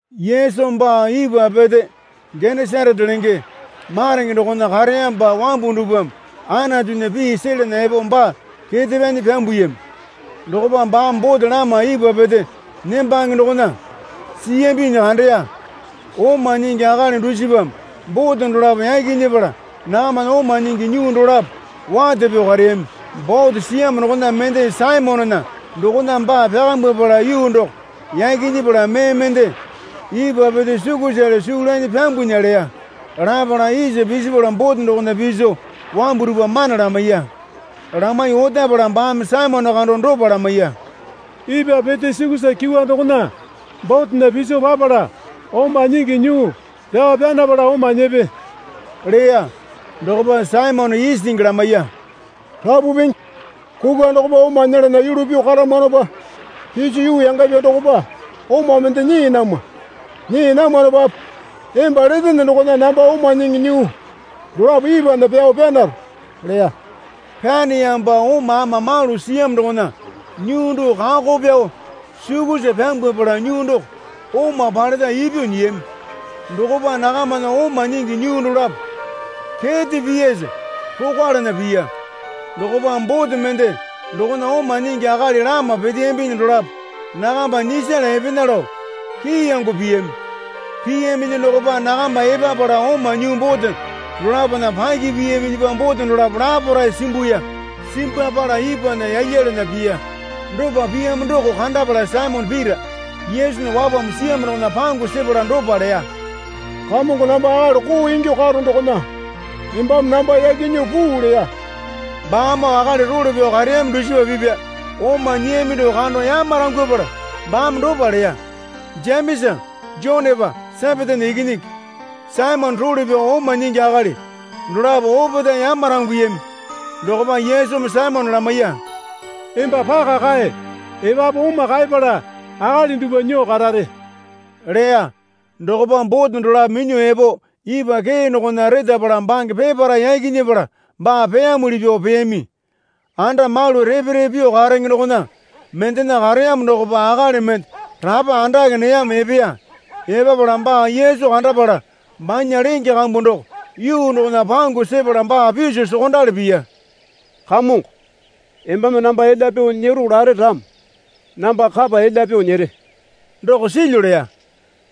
Yesu baa ipwa pete Genesarete lenge marenge dokona kareyamopa wambu dupwame Anatunya pii selana epo baa kete pyanyi pyambuyami. Dokopa baame bote lama ipwa pete nembange dokona siyambinyi kandeya. Oma nyingi akali dusipame bote dolapo yaki nyepala nakamana oma nyingi nyuu dolapo wate pyuo kareyami. Bote siyamo dokona mende Saimonena dokona baa pyakambwapala yuu doko yaki nyepala mee mende ipwa pete sukusale suu lanyi pyambunya leya. Lapala isa pisipala bote dokona piso wambu dupwa mana lamaiya. Lamaiyuo otapala baame Saimone kando dopa lamaiya. Ipwa pete sukusa kyuwa dokona botena piso papala oma nyingi nyuu pyao pyanapala oma nyepe leya. Dokopa Saimone isingi lamaiya. Rapu Pingi, kukwa dokopa oma nyelana yulu pyuo karamwanopa piso yuu yangapya dokopa oma mende nyii namwa. Nyii namwanopape emba letene dokona namba oma nyingi nyuu dolapo ipwana pyao pyanaro, leya. Pyaniyamopa oma ama malu siyamo dokona nyuu doko kako pyao sukusa pyambwapala nyuu doko oma paleta ipyuo nyiyami. Dokopa nakamana oma nyingi nyuu dolapo kete piyasa rokwalana piya. Dokopa bote mende dokona oma nyingi akali lama peteyambi dolapo nakamba nyisala epena lao kiyango piyami. Piyaminyi dokopa nakamba epapala oma nyuu bote dolapona paki piyaminyipa bote dolapo laparae simbuya. Simbwapala ipwana yalyalana piya. Dopa piyamo doko kandapala Saimone Pita Yesunya wapambu siyamo dokona pangu sepala dopa leya. Kamongo namba akali koo ingyuo karono dokona embame namba yaki nyuo puu leya. Baamoo akali role pyao kareyami dusipa pipya oma nyiyami doko kando yamarangwapala baame dopa leya. Jemesa Jonepa Sepetena ikinyingi Saimonena role pyao oma nyingi akali dolapo opetae yamaranguyami. Dokopa Yesumi Saimone lamaiya. Emba paka kae. Epapu oma kaepala akali dupwa nyuo karare, leya. Dokopa bote dolapo minyuo epo ipwa kee dokona retapala bange peparae yaki nyepala baa peyamuli pyuo peyami. Anda malu repe repe pyuo karenge dokona mendena kareyamo dokopa akali mende rapa andake neyamo epeya. Epapala baa Yesu kandapala banya lenge kambu doko yuu dokona pangu sepala baa piso sokondali piya. Kamongo, embame namba elya pyuo nyero lare ramo namba kapa elya pyuo nyere, doko silyu leya.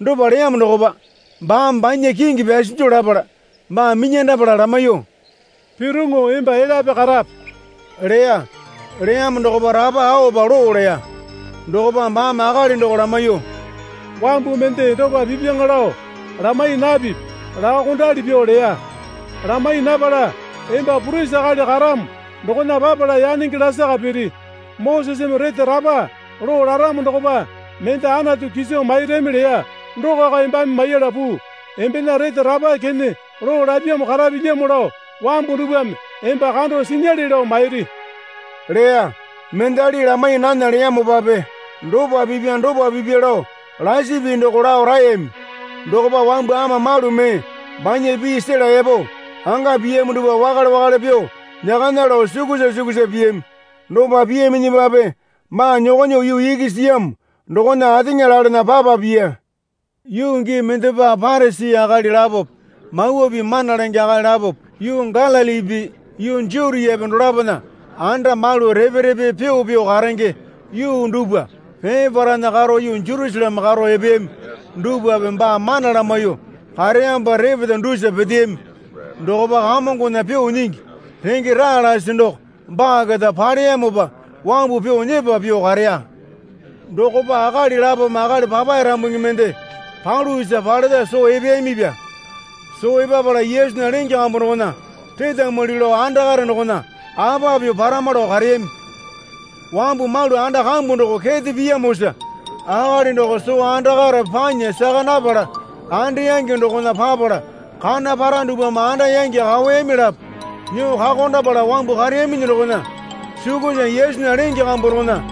Dopa leyamo dokopa baame banya kingi pyasinju lapala baa minyandapala lamaiyuo, Piroŋo emba elyape karape, leya. Leyamo dokopa rapa aopa loo leya. Dokopa baame akali doko lamaiyuo, Wambu mende dopa pipyaŋa lao lamai napipi, laokondali pyuo leya. Lamai napala emba purisi akali karamo dokona papala yanenge lasaka piri. Moseseme rete rapa loo laramo dokopa mende Anatu kiso mairami leya dokoko embame maiyala puu. Embena rete rapa kene loo lapyamo karapilyamo lao wambu dupwame emba kando sinyale lao mairi, leya. Mendali lamai nana leyamopape dopa pipya dopa pipya lao lasi pii doko lao raeyami. Dokopa wambu ama malu mee banya pii sela epo anga piyamo dupwa wakale wakale pyuo nyakana lao sukusa sukusa piyami. Dopa piyaminyipape baa nyokonyuo yuu iki siyamo dokona ateŋa lalena papa piya. Yuu gii mendepa Parisi akali lapope Mawa Pii mana lenge akali lapope yuu Galilipi yuu Jutiape dolapona anda malu repe repe pyuo pyuo karenge yuu dupwa peparaena karo yuu Jerusaleme karo epeyami dupwape baa mana lamaiyuo kareyamopa repeta dusa peteyami. Dokopa Kamongona pyuo nyingi renge raa lasi doko baa keta paleyamopa wambu pyuo nyepa pyuo kareya. Dokopa akali lapome akali papae rambungi mende palu isa paleta soo epeyamipya. Soo epapala Yesunya lenge kambu dokona retamwali lao andakare dokona apa pyuo parama lao kareyami. Wambu malu anda kambu doko kete piyamosa akali doko soo andakare panya saka napala andeyangi dokona papala kana para dupwame anda yangi kaoyami lapo nyuo kakondapala wambu kareyaminyi dokona sukusa Yesunya lenge kambu dokona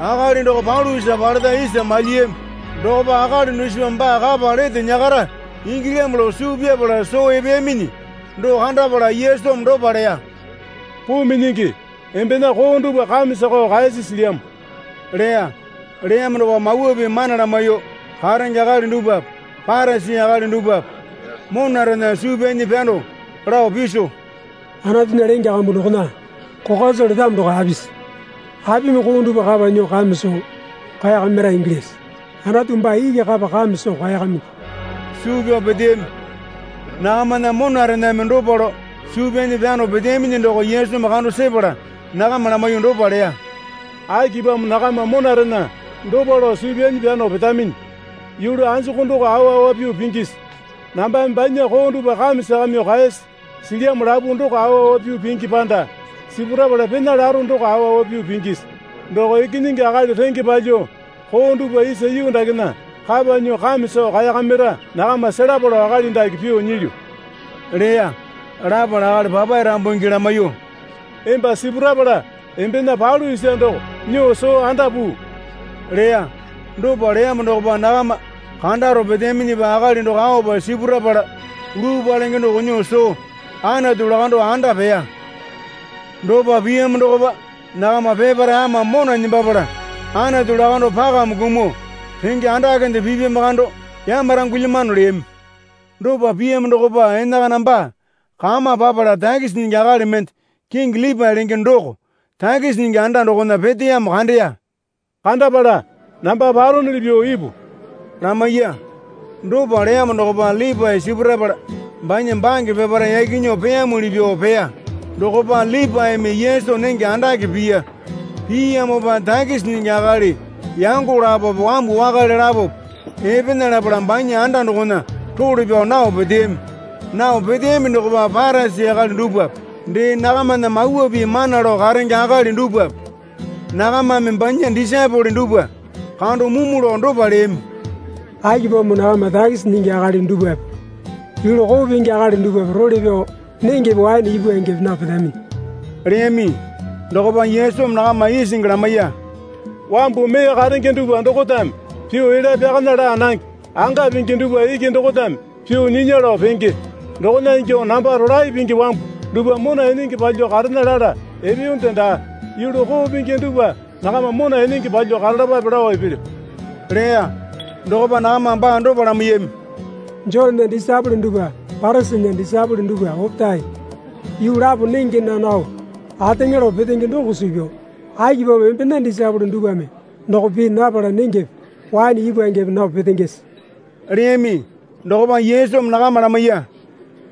akali doko palu isa paleta isa malyiyami. Dokopa akali dusipame baa kapa lete nyakara ingilyamo lao suu pyapala soo epeyaminyi doko kandapala Yesumi dopa leya. Puu minyingi embena koo dupwa kame sakao kaeyasi silyamo leya. Leyamo dokopa Mawa Pii mana lamaiyuo karenge akali dupwape Parisi akali dupwape monarena suu pyanyi pyano lao piso, Anatunya lenge kambu dokona kokwa soo letamo doko apisi? Apimi koo dupwa kapa nyuo kame soo kaeyakamira ingilyase? Anatu baa iki kapa kame soo kaeyakamingi, suu pyao peteyami. Nakamana monarename dopa lao suu pyanyi pyano peteyaminyi doko Yesumi kando sepala nakama lamaiyuo dopa leya. Akipamo nakama monarena dopa lao suu pyanyi pyano petaminyi? Yulu anjuku doko awa awa pyuo pingisi? Nambame banya koo dupwa kame sakamyuo kaeyasi silyamo lapu doko awa awa pyuo pingi panda sipurapala pena laro doko awa awa pyuo pingisi? Doko Ikinyingi Akali renge palyuo koo dupwa isa yuu dakena kapa nyuo kame soo kaeyakamira nakama selapa lao akali dake pyuo nyilyu, leya. Lapala akali papae rambungi lamaiyuo, Emba sipurapala embena palu isa doko nyuo soo anda puu, leya. Dopa leyamo dokopa nakama kandaro peteyaminyipa akali doko aopa sipurapala luu palenge doko nyuo soo Anatu lakando anda peya. Dopa piyamo dokopa nakama peparae ama mona nembapala Anatu lakando pakame kumuo, renge andakende pipyamo kando yamarangulyamano, leyami. Dopa piyamo dokopa enakana baa kama papala takisi nyingi akali mende kingi Lipae lenge doko takisi nyingi anda dokona peteyamo kandeya. Kandapala, Namba paronuli pyuo ipu, lamaiya. Dopa leyamo dokopa Lipae sipurapala banya bange peparae yaki nyuo peyamuli pyuo peya. Dokopa Lipaeme Yesu nenge andake piya. Piyamopa takisi nyingi akali yango lapope wambu wakale lapope epena lapala banya anda dokona role pyao nao peteyami. Nao peteyami dokopa Parisi akali dupwape dee nakamana Mawa Pii mana lao karenge akali dupwape nakamame banya disaepole dupwa kando mumu lao dopa leyami. Akipamo nakama takisi nyingi akali dupwape yulu koo pingi akali dupwape role pyao nengepe waene ipwangepe nao petaminyi? leyami. Dokopa Yesumi nakama isingi lamaiya. Wambu mee karenge dupwa dokotame pyuo elya pyakana laa nange. Anga pingi dupwa iki dokotame pyuo nyinya lao penge. Dokona ingyuo namba rolae pingi wambu dupwa mona enenge palyuo karena lala epeyonde daa. Yulu koo pingi dupwa nakama mona enenge palyuo karalapape lao epelyo leya. Dokopa nakamame baa dopa lamaiyami. Jonena disaepole dupwa Parisinya disaepole dupwa opetae yuu lapo nenge naa nao ateŋa lao petenge doko suu pyao akipamo embena disaepole dupwame doko pii napala nengepe waene ipwangepe nao petengese? leyami. Dokopa Yesumi nakama lamaiya.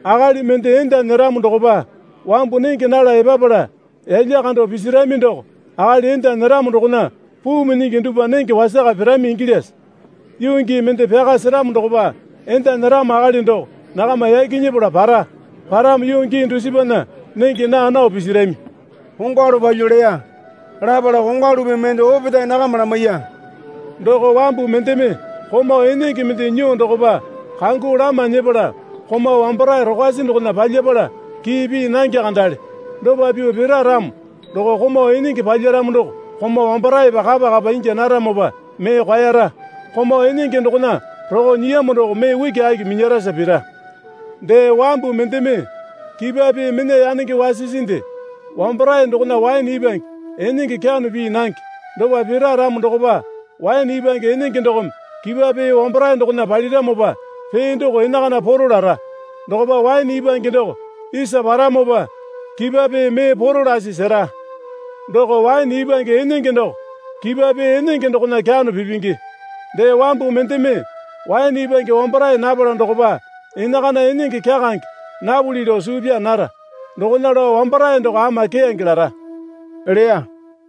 Akali mende enda nyeramo dokopa wambu nenge nala epapala yalya kando pisirami doko akali enda nyeramo dokona puu minyingi dupwa nenge wasaka pirami ingilyase? Yuu gii mende pyaka seramo dokopa enda nyeramo akali doko nakama yaki nyepala para. Paramo yuu gii dusipana nenge naa nao pisirami, kongwalu palyuo leya. Lapala kongwalu pii mende opetae nakama lamaiya. Doko wambu mendeme komau enenge mende nyuo dokopa kangu lama nyepala komau wambarae rokwasi dokona palyapala kii pii nange kandale. Dopa pyuo pira ramo doko komau enenge palyaramo doko komau wambaraepa kapa kapa ingya naramopa mee kwaera. Komau enenge dokona roko nyiyamo doko mee ukiaki minyarasa pira. Dee, wambu mendeme kipwa pee mena yanenge wasisinde wambarae dokona waene ipwange enenge kyano pii nange. Dopa pira ramo dokopa waene ipwange enenge dokome kipwa pee wambarae dokona paliramopa pee doko enakana poro lara. Dokopa waene ipwange doko isa paramopa kipwa pee mee poro lasi sera. Doko waene ipwange enenge doko kipwa pee enenge dokona kyano pipingi. Dee, wambu mendeme waene ipwange wambarae napala dokopa enakana enenge kyakange napuli lao suu pyaa nara. Dokona lao wambarae doko ama keyange lara leya.